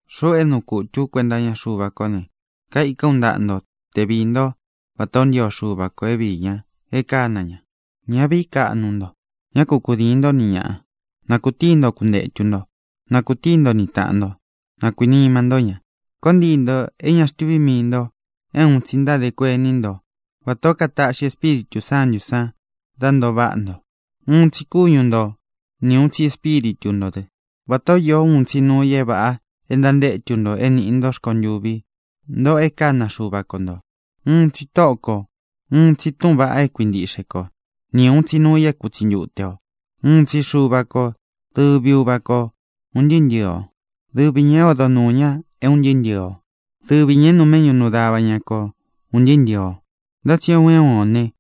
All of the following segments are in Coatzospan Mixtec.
Xuꞌu é nuu kútū ú kuenta iña Xuva kó ne, kaikán u ntaꞌa nto te viī ntó vatā ó ntio Xuva kō é vīí ña e kána ña. Ñá vīí kaꞌnu nto. Ñá ku kudīin nto ni ñaꞌa. Na kūtíi nto kuntētu nto. Na kūtíi nto ni tāꞌan nto. Na kuīnima ntó ña. Koo ntii ntō é ña xtuví mii ntō é uun tsi ntádē kuení nto vatā ó katáꞌxi Espíritū Sántū san dá ntoo váꞌa nto. Uun tsi kúñu nto, ni ūun tsi Espíritu ntō dɨ́, vatā ó īó uun tsi nuu i é vāꞌa e ntantétu nto é nīꞌi ntó rkontuvi, ntoꞌo é kána Xuva ko ntō. Uun tsi Tóꞌo kō, uun tsi túꞌūn vaꞌa é kuintiꞌxe ko, ni ūun tsi nuu i é kutsi ntute o. Uun tsi Xuva ko, dɨvi Uva ko ūn ntɨɨ́ ntɨ̄ɨ o. Dɨvi ñā é odo nuū ña é un ntɨɨ́ ntɨ̄ɨ o. Dɨvi ñā é nuu méꞌñu nuu dava ña ko ūn ntɨɨ́ ntɨ̄ɨ o. Ntá tsi é un é un ō ne,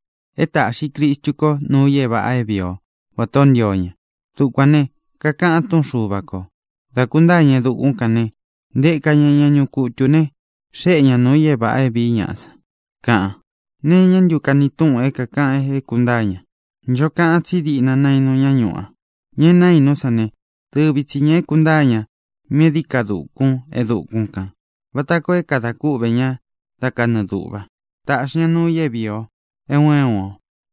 é tāꞌxi Cristu ko nuu i é vāꞌa é vīi ó, vatā o ntío ña. Dukuān ne, kakaꞌan túꞌun Xuva kō: Da kūntáa ña e dukún kān ne, ntēka ñá ña ñuꞌu kutū ne, xéꞌe ña nuū i é vāꞌa é vīí ñaꞌa san, kaꞌan. ¿Nee iñá ntu kani tuꞌun é kākaꞌan é kūntáa ña? Ncho kaꞌan tsí diꞌna naínu ña ñuꞌu a. Ña e naínú san ne, dɨvi tsi ñā é kūntáa ña míꞌī e dií ka dukun e dukún kān vata koo é kadā kúꞌvē ñá da kanɨɨ dūꞌva. Tāꞌxi ña nuu i é vīi o, é un é un o.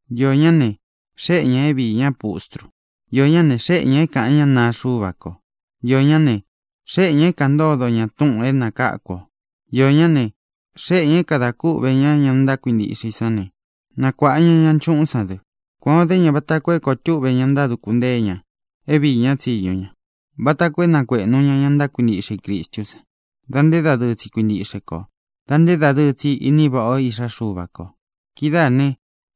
Iō ñá ne, xéꞌe ñā é viī ñá pustru. Iō ñá ne, xéꞌe ñā é kāꞌan ñá naa Xuva ko. Iō ñá ne, xéꞌe ñā é kāꞌan ntódo ña túꞌūn é nakáku ō. Iō ñá ne, xéꞌe ñā é kadā kúꞌvē ñá ña ntákuintiꞌxe i sán ne, nakuāꞌa ña ña nchuꞌún san dɨ. Kuān o dé ña vata koo é koo túꞌve ña ntáduku ntée ña é viī ñá tsiñu ña, vata koo é nakuēꞌnu ña ña ntákuintiꞌxe i Cristú san da nté dadɨɨ tsi kuintiꞌxe ko, dā nté dadɨɨ tsi ini váꞌa o Iꞌxá Xuva kō. Kidáā ne,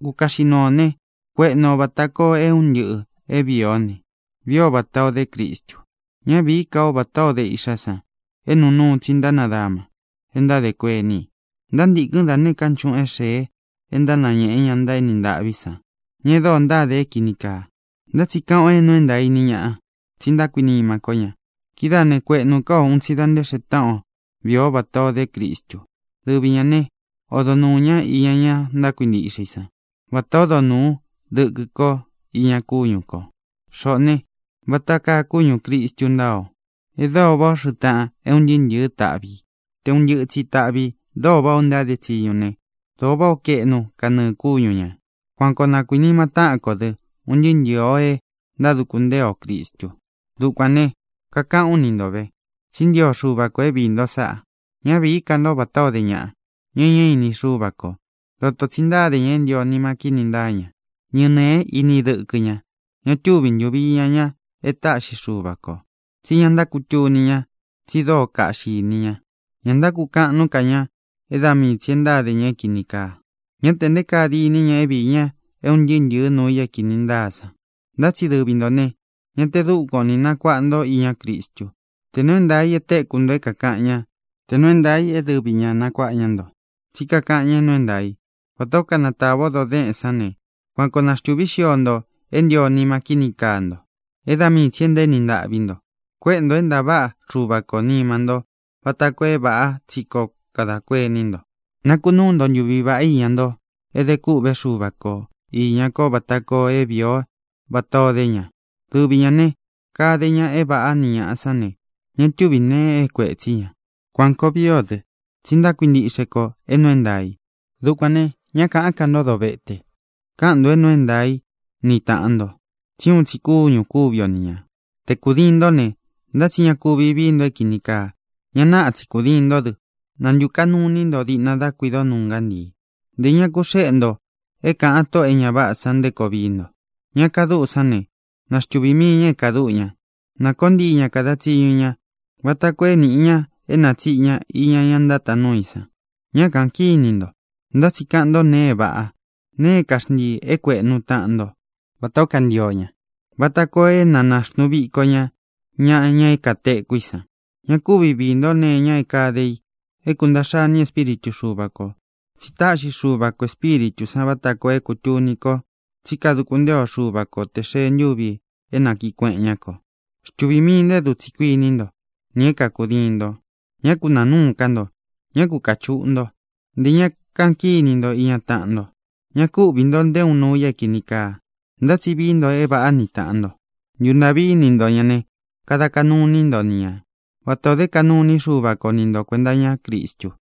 kukaꞌxi nuu ō ne, kuéꞌnu ō vata koo é un ntɨꞌɨ̄ é vīi ó ne, vií o vatā o dé Cristu. Ñá vīí ka o vatā ó de iꞌxá san é nuu nuu tsi ntánadama e ntádē kuení i. Ntántīkɨn dá nēé ka nchuꞌun é xēe e ntánañēꞌe ña ntaéni ntaꞌví san, ña e dóo ntáde é kīni kaa. Ntá tsi kaꞌan o é nuu é ntaā í ni ñāꞌa, tsi ntákuinima kó ña. Kidáā ne, kueꞌnu ká o un tsi dā nte xee táꞌan o vii o vatā o dé Cristu. Dɨvi ñā né, odo nuū ñá iña ña ntákuintiꞌxe i sán vatā ó odo nūu dɨkɨ ko iña kúñu kō. Xoꞌō ne, vata káa kúñū Cristu ntáa o, é dóo váꞌā ó xɨꞌɨ taꞌan é un ntɨɨ́ ntɨ̄ɨ́ taꞌvi ī. Te ūn ntɨ́ꞌɨ tsi taꞌvi ī dóo váꞌā ó ntáde tsiñu ne, dóo váꞌā ó kaeꞌnu kanɨɨ̄ kúñu ñā. Kuan koo na kuīnima táꞌan kō dɨ, un ntɨɨ́ ntɨ̄ɨ o e ntáduku ntée o Cristu. Dukuān ne, kakaꞌán u ni nto vē, tsí ntio Xuva kō é viī nto sáꞌa. Ñá vīí ka nto vatā ó de ñaꞌa, ña é ña ini Xúva kō. Dotō tsi ntáde ña é ntio nima kíni ntáa ña. Ñɨnēé ini dɨkɨ ña. Ña túvi ntuvi iña ña e táꞌxi Xuva kō, tsí ña ntákutuni ña, tsi dóo kaꞌxi ini ña. Ña ntákukaꞌan nuú ka ña é da mii tsī e ntáde ña é kīni kaa. Ñá tē nté kaa diní ña é viī ña é un ntɨɨ́ ntɨ̄ɨ́ nuu i é kīni ntáa san. Ntá tsi dɨvi ntō ne, ñá tē dúkuan ō ni nakuaꞌa nto íña Cristu, tē nuu é ntaā i e téku nto é kākaꞌan ñá, tē nuu é ntaā i é dɨvi ña nakuāꞌa ña nto; tsí kakaꞌan ña é nuu é ntaā i. Vatā ó kanatāva o doo déꞌén san ne, kuan koo naxtūví xio nto é ntio nima kíni kaa nto, é da mii tsī e ntaéni ntaꞌví nto. Kuéꞌe ntō é ntaváꞌa Xuva kō nima ntó vata koo é vāꞌá tsi koo kadā kuení nto. Nakunúu nto ntuvi vāꞌá iña nto é dē kûꞌvé Xuva ko īña ko vata koo é vīi o vátā ó de ña. Dɨvi ñā ne, kade ña é vāꞌá ni ñāꞌa sán ne, ña túvi nēe é kuētsí ña. Kuān koo vií o dɨ, tsi ntákuintiꞌxe kō é nuu é ntaā i. Dukuān ne, ñá kāꞌán ka nto dovéte. Kaꞌan nto é nuu é ntaā í ni tāꞌan nto, tsí uun tsi kúñū kúvi o ni ñā. Te kūdiin ntó ne, ntá tsi ña ku viī nto é kīni kaa. Ña naꞌa tsi kudīin ntó dɨ, na ntūkaꞌnu iní nto diꞌna dá kuido nuu ngántii. Ntē ña ku xeꞌe nto é kāꞌan tóꞌō e ña váꞌā san nté koo vií nto. Ña kadúꞌu sán ne, na xtuvī mii ña é kāduꞌu ña. Na kōó ntii ña kada tsiñu ña vata koo é nīꞌi ña é natsīꞌi ña iña ña ntátaan nuú i san. Ñá kāꞌan kíni nto, ntá tsi kaꞌan ntó nēe é vāꞌá, nēe é kaxntīi é kuēꞌnú taꞌan nto vatā ó kantio ña, vata koo é na nāxnuu viko ña ñaꞌa, ña kateku í san. Ña ku vii nto nee iña é kāde i é kuntāꞌxa iní Espíritu Xuva kō, tsi táꞌxi Xuva kō Espíritū san vata koo é kūtuni ko tsi ntáduku ntée o Xuva ko tē xee ntúvi é nakiꞌī kueꞌen ñá kō. Xtuvī mii nto é dutsī kuiní nto, nī é kakudiin nto. Ñá ku nāa núu ká nto. Ñá ku kāchuꞌu ntó. Ntē ña kaꞌan kíni nto iña taꞌan nto. Ñá ku viī nto nté uun nuu i é kīni kaa. Ntá tsi vií nto é vāꞌá ni tāꞌan nto. Ntuntāꞌví ini nto ñā ne, kada kaꞌnu iní nto ni ña vatā ó de kaꞌnu iní Xuva ko ni nto kuēnta iñá Cristu.